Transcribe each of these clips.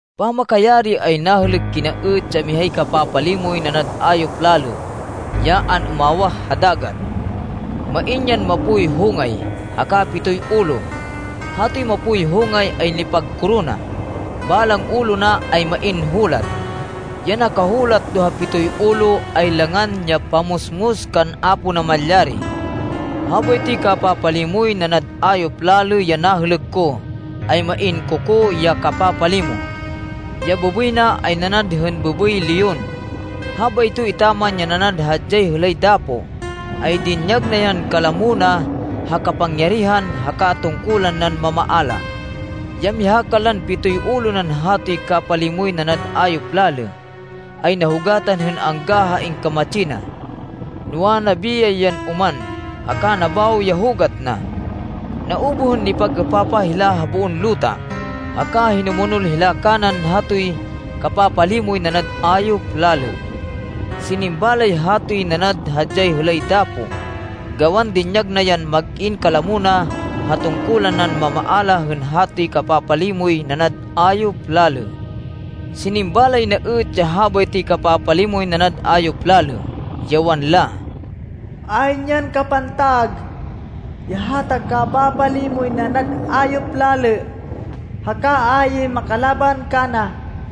Pamakayari ay nahêlêk kina êt ya mihay kapapalimoy nanad ayop lalê ya an-umawah ha dagat. Main yan mapoy hongay, haka pitoy ulo. Hatoy mapoy hongay ay nipagkorona. Balang ulo na ay main hulat. Ya nakahulat do ha pitoy ulo ay langan ya pamusmus kan Apo Namalyari. Habaytoy kapapalimoy nanad ayop lalê ya nahêlêk ko ay main kokó ya kapapalimo. Ya bêbêy na ay nanad hên bêbêy leon. Habayto etaman ya nanad hadyay hêlay dapo, ay dinyag na yan kalamo na ha kapangyarihan haka tungkulan nan mamaala. Ya miha kanlan pitoy ulo nan hatoy kapalimoy nanad ayop lalê, ay nahugatan hên angga ha ingkamatsi na. Noa, nabiyay yan oman, haka nabawo ya hugat na. Naubuh hên nipag-êpapah hila ha boon luta, haka hinumonol hila kanan hatoy kapapalimoy nanad ayop lalê. Sinimba lay hatoy nanad hadyay hêlay dapo gawan dinyag na yan mag-in kalamo na ha tungkulan nan mamaala hên hatoy kapapalimoy nanad ayop lalê. Sinimba lay na êt ya habaytoy kapapalimoy nanad ayop lalê, ya wanla, “Ayn yan kapantag ya hata kapapalimoy nanad ayop lalê haka ayn makalaban kana!”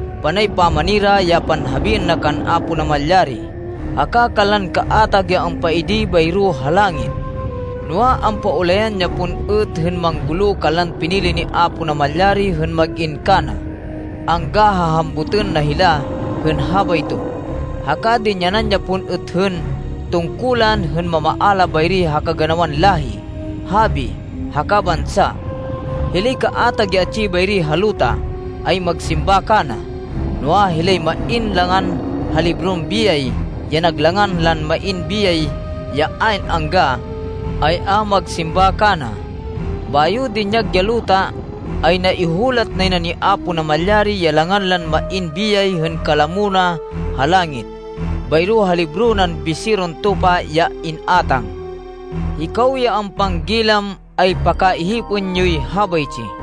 Panay pamanira ya panhabiên na kan Apo Namalyari haka kanlan kaatag ya ampaidi bayro ha langit. Noa, ampaulayan ya pon êt hên manggulo kanlan pinili ni Apo Namalyari hên mag-in kana, angga ha hambutên na hila hên habayto. Haka dinyanan ya pon êt hên tungkulan hên mamaala bayri ha kaganawan láhi, habi, haka bansa. Hilay kaatag ya atsi bayri ha luta ay magsimba kana, noa, hilay main langan ha libron biyay, ya nag langan lan main biyay ya ayn angga, ay a magsimba kana. Bayo dinyag ya luta, ay naihulat nay na ni Apo Namalyari ya langan lan main biyay hên kalamo na ha langit, bayro ha libro nan Biseron Tupa ya in-átang. “Hikaw ya ampanggilam, ay pakaihipên yoy habaytsi: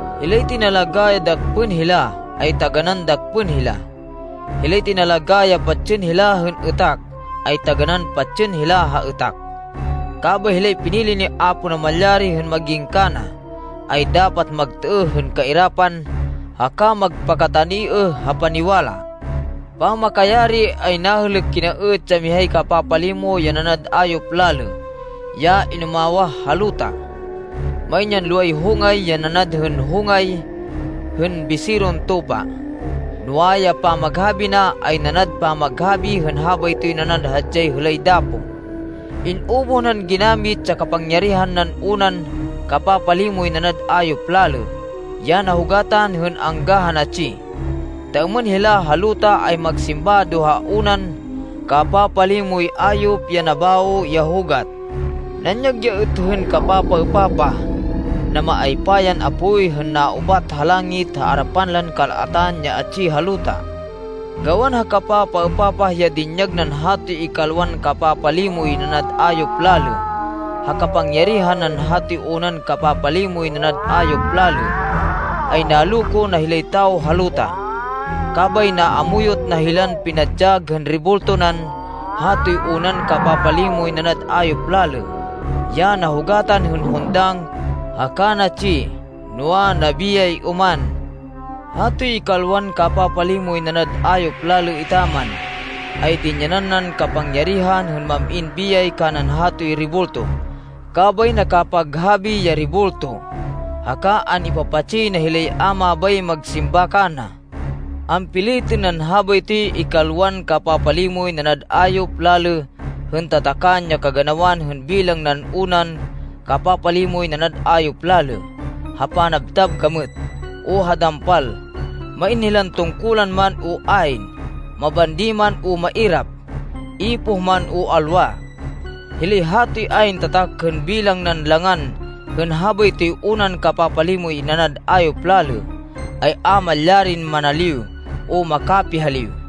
Hilay tinalagá ya dakpên hila, ay taganán dakpên hila. Hilay tinalagá ya patsên hila hên êtak, ay taganán patsên hila ha êtak. Kabay hilay pinili ni Apo Namalyari hên mag-in kana, ay dapat magtêêh hên kairapan haka magpakataniêh ha paniwala.” Pamakayari, ay nahêlêk kina êt ya mihay kapapalimo ya nanad ayop lalê ya inumawah ha luta. Main yan loway hongay ya nanad hên hongay hên biseron tupa, noa, ya pamaghabi na ay nanad pamaghabi hên habaytoy nanad hadyay hêlay dapo. In-ubuh nan ginamit ya kapangyarihan nan unan kapapalimoy nanad ayop lalê ya nahugatan hên angga ha natsi, ta êmên hila ha luta ay magsimba do ha unan kapapalimoy ayop ya nabawo ya hugat. Nanyag ya êt hên kapapaêpapah. Namaaypa yan apoy hên naubat ha langit ha arapan lan kal-atan ya atsi ha luta. Gawan ha kapapaêpapah ya dinyag nan hatoy ikalwan kapapalimoy nanad ayop lalê ha kapangyarihan nan hatoy unan kapapalimoy nanad ayop lalê, ay naloko na hilay tawo ha luta. Kabay naamuyot na hilan pinadyag hên rebulto nan hatoy unan kapapalimoy nanad ayop lalê ya nahugatan hên hundang haka natsi, noa, nabiyay oman. Hatoy ikalwan kapapalimoy nanad ayop lalê etaman, ay dinyanan nan kapangyarihan hên mam-in biyay kanan hatoy rebulto, kabay nakapaghabi ya rebulto, haka an-ipapatsi na hilay a mabay magsimba kana. Ampilitên nan habaytoy ikalwan kapapalimoy nanad ayop lalê hên tatakan ya kaganawan hên bilang nan unan kapapalimoy nanad ayop lalê ha panabtab gamêt o ha dampal, main hilan tungkulan man o ayn, mabandi man o mairap, ipoh man o alwa. Hilay hatoy ayn tatak hên bilang nan langan hên habaytoy unan kapapalimoy nanad ayop lalê, ay a malyarin manaliw o makapihaliw.